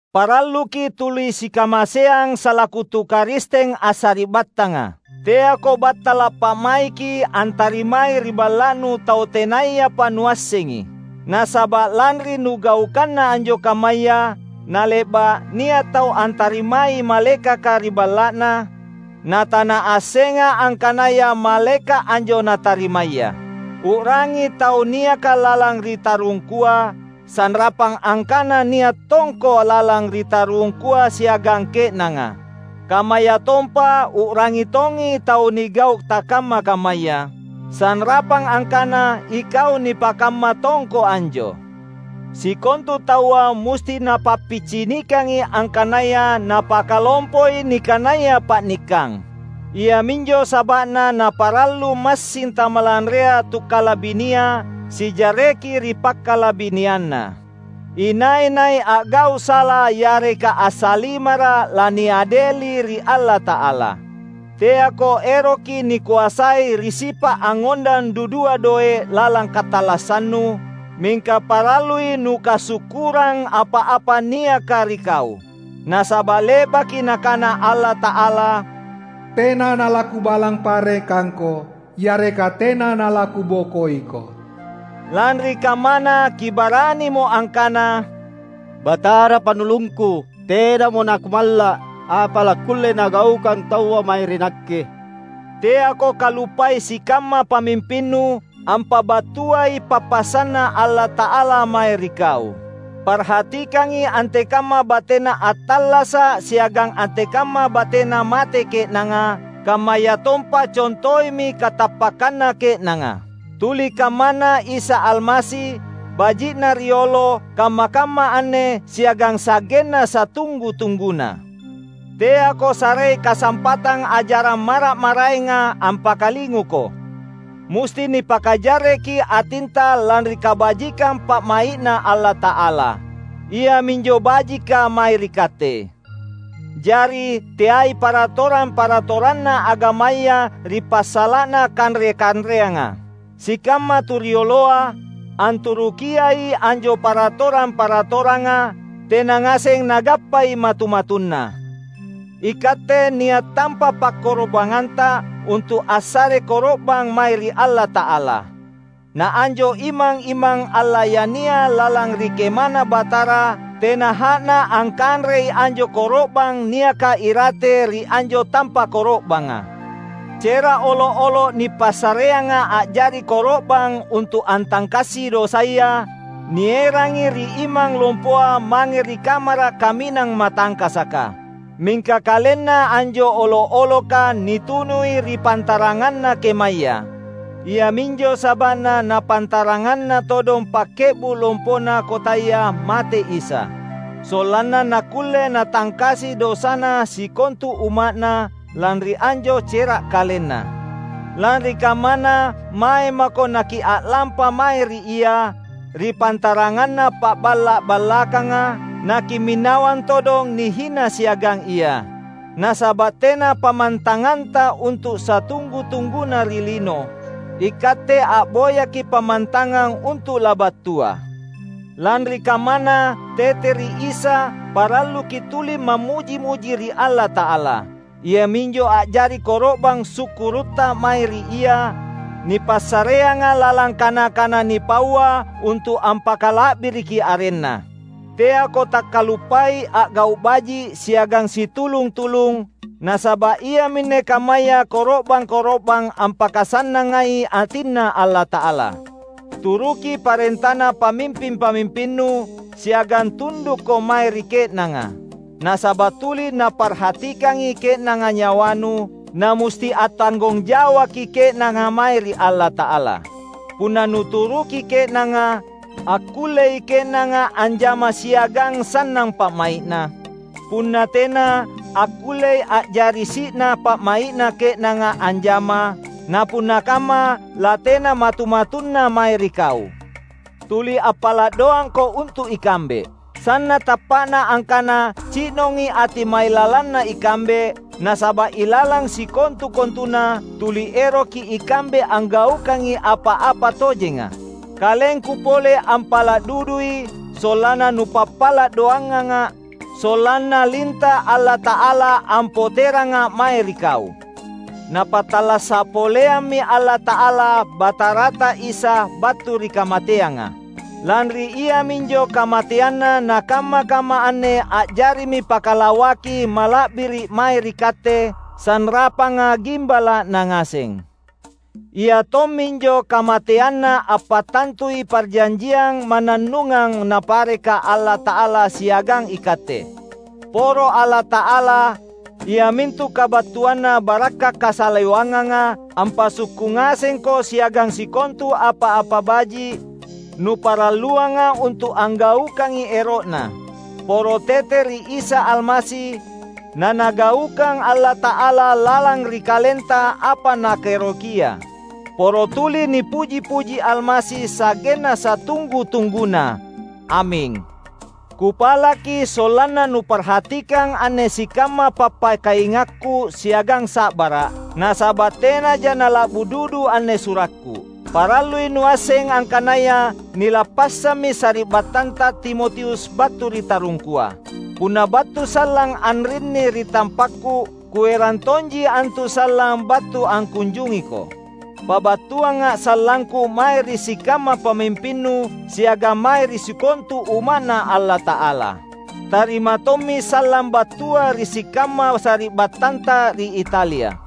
Paralluki’ tuli sikamaseang salaku tu Karisteng assari’battanga. Teako battala’ pa’maiki antarimai ri balla’nu tau tenayapa nuassengi. Nasaba’ lanri nugaukanna anjo kammaya, nale’ba’ nia’ tau antarimai malaekaka ri balla’na, na tanaassenga angkanaya malaeka’ anjo natarimaya. U’rangi tau niaka lalang ri tarungkua, sanrapang angkana nia’ tongko lalang ri tarungkua siagang ke’nanga. Kammayatompa u’rangi tongi tau nigau’ takamma-kammaya, sanrapang angkana ikau nipakamma tongko anjo. Sikontu taua musti napappicinikangi angkanaya napakalompoi nikanaya pa’nikkang; iaminjo saba’na naparallu massing tamalanrea tukkalabinia sijarreki ri pakkalabinianna. Inai-nai a’gau’ sala yareka assalimara’ laniadeli ri Allata’ala. Teako eroki nikoasai ri sipa’ angngondang dudua doe’ lalang katallassannu, mingka parallui nukasukkurang apa-apa niaka ri kau. Nasaba’ le’baki Nakana Allata’ala, "Tena nalaKubalang parekangko yareka tena nalaKubokoiko." Lanri kammana kibaranimo angkana, "Batara Pannulungku, tenamo nakumalla’. Apa lakkulle nagaukang taua mae ri nakke?" Teako kaluppai sikamma pamimpinnu, ampabattuai pappasanNa Allata’ala mae ri kau. Parhatikangi antekamma batena attallasa’ siagang antekamma batena mate ke’nanga, kammayatompa contoimi katappakkanna ke’nanga. Tuli kammana Isa Almasi, baji’ na riolo, kamma-kamma anne, siagang sa’genna satunggu-tungguna. Teako sarei kasampatang ajarang mara’-maraenga ampakalinguko. Musti nipakajarreki atinta lanri kabajikang pa’mai’Na Allata’ala; iaminjo bajika mae ri katte; jari teai paratorang-paratoranna agamaya ri passala’na kanre-kanreanga. Sikamma tu rioloa, anturukiai anjo paratorang-paratoranga, tena ngaseng nagappai matu-matunna. Ikatte nia’ tampa’ pakkorobangnganta untu’ assare koro’bang mae ri Allata’ala. Na anjo imang-imang allayania lalang ri KemaNa Batara, tena ha’na angkanrei anjo koro’bang niaka irate ri anjo tampa’ koro’banga. Cera’ olo’-olo’ nipassareanga a’jari koro’bang untu’ antangkasi dosaya, nierangi ri imang lompoa mange ri Kamara’ Kaminang Matangkasaka; mingka kalenna anjo olo’-oloka nitunui ri pantaranganna kemaya. Iaminjo saba’na napantaranganna todong pakke’bu’ lompona kotaya mate Isa, sollanna nakkulle Natangkasi dosana sikontu umma’Na, lanri anjo cera’ KalenNa. Lanri kammana, mae mako nakia’lampa mae ri Ia, ri pantaranganna pa’balla’-ballakanga, nakimminawang todong nihina siagang Ia. Nasaba’ tena pammantanganta untu’ satunggu-tungguna ri lino; ikatte a’boyaki’ pammantangang untu’ labattua. Lanri kammana, tete ri Isa, paralluki’ tuli mammuji-muji ri Allata’ala; iaminjo a’jari koro’bang sukkurutta mae ri Ia, nipassareanga lalang kana-kana nipaua untu’ ampakala’biriki arenNa. Teako takkaluppai a’gau’ baji’ siagang situlung-tulung, nasaba’ iaminne kammaya koro’bang-koro’bang ampakasannangai atinNa Allata’ala. Turuki parentana pamimping-pamimpinnu, siagang tundukko mae ri ke’nanga. Nasaba’ tuli naparhatikangi ke’nanga nyawanu, namusti attanggong jawaki ke’nanga mae ri Allata’ala. Punna nuturuki ke’nanga, akkullei ke’nanga anjama siagang sannang pa’mai’na; punna tena, akkullei a’jari si’na pa’mai’na ke’nanga anjama, napunna kamma latena matu-matunna mae ri kau. Tuli appala’ doangko untu’ ikambe. Sanna’ tappa’na angkana ci’nongi ati mailalanna ikambe, nasaba’ ilalang sikontu-kontuna, tuli eroki ikambe anggaukangi apa-apa tojenga. Kalengku pole ampala’ dudui, sollanna nupappala’ doanganga’, sollanna linta’ Allata’ala ampoteranga’ mae ri kau. Napattallasa’ poleammi Allata’ala Batarata Isa battu ri kamateanga. Lanri iaminjo kamateanNa nakamma-kamma anne a’jarimi Pakalawaki Mala’biri’ mae ri katte, sanrapanga gimbala’Na ngaseng. Ia tomminjo kamateanNa ampattantui parjanjiang mannannungang Napareka Allata’ala siagang ikatte. Poro Allata’ala, iamintu kabattuanna barakka’ kasalewanganga ampassukku’ ngasengko siagang sikontu apa-apa baji’, nuparalluanga untu’ anggaukangi ero’Na. Poro tete ri Isa Almasi, naNagaukang Allata’ala lalang ri kalenta apa Nakaerokia. Poro tuli nipuji-puji Almasi sa’genna satunggu-tungguna! Aming. Kupalaki sollanna nuparhatikang anne sikamma pappakaingakku siagang sa’bara’, nasaba’ tenaja nala’bu dudu anne surakku. Parallui nuasseng angkanaya nilappassammi sari’battanta Timotius battu ri tarungkua. Punna battu sallang anrinni ri tampakku, kuerang tonji antu sallang battu angkunjungiko. Pabattuanga’ sallangku mae ri sikamma pamimpinnu siagang mae ri sikontu Umma’Na Allata’ala. Tarima tommi sallang battua ri sikamma sari’battanta ri Italia.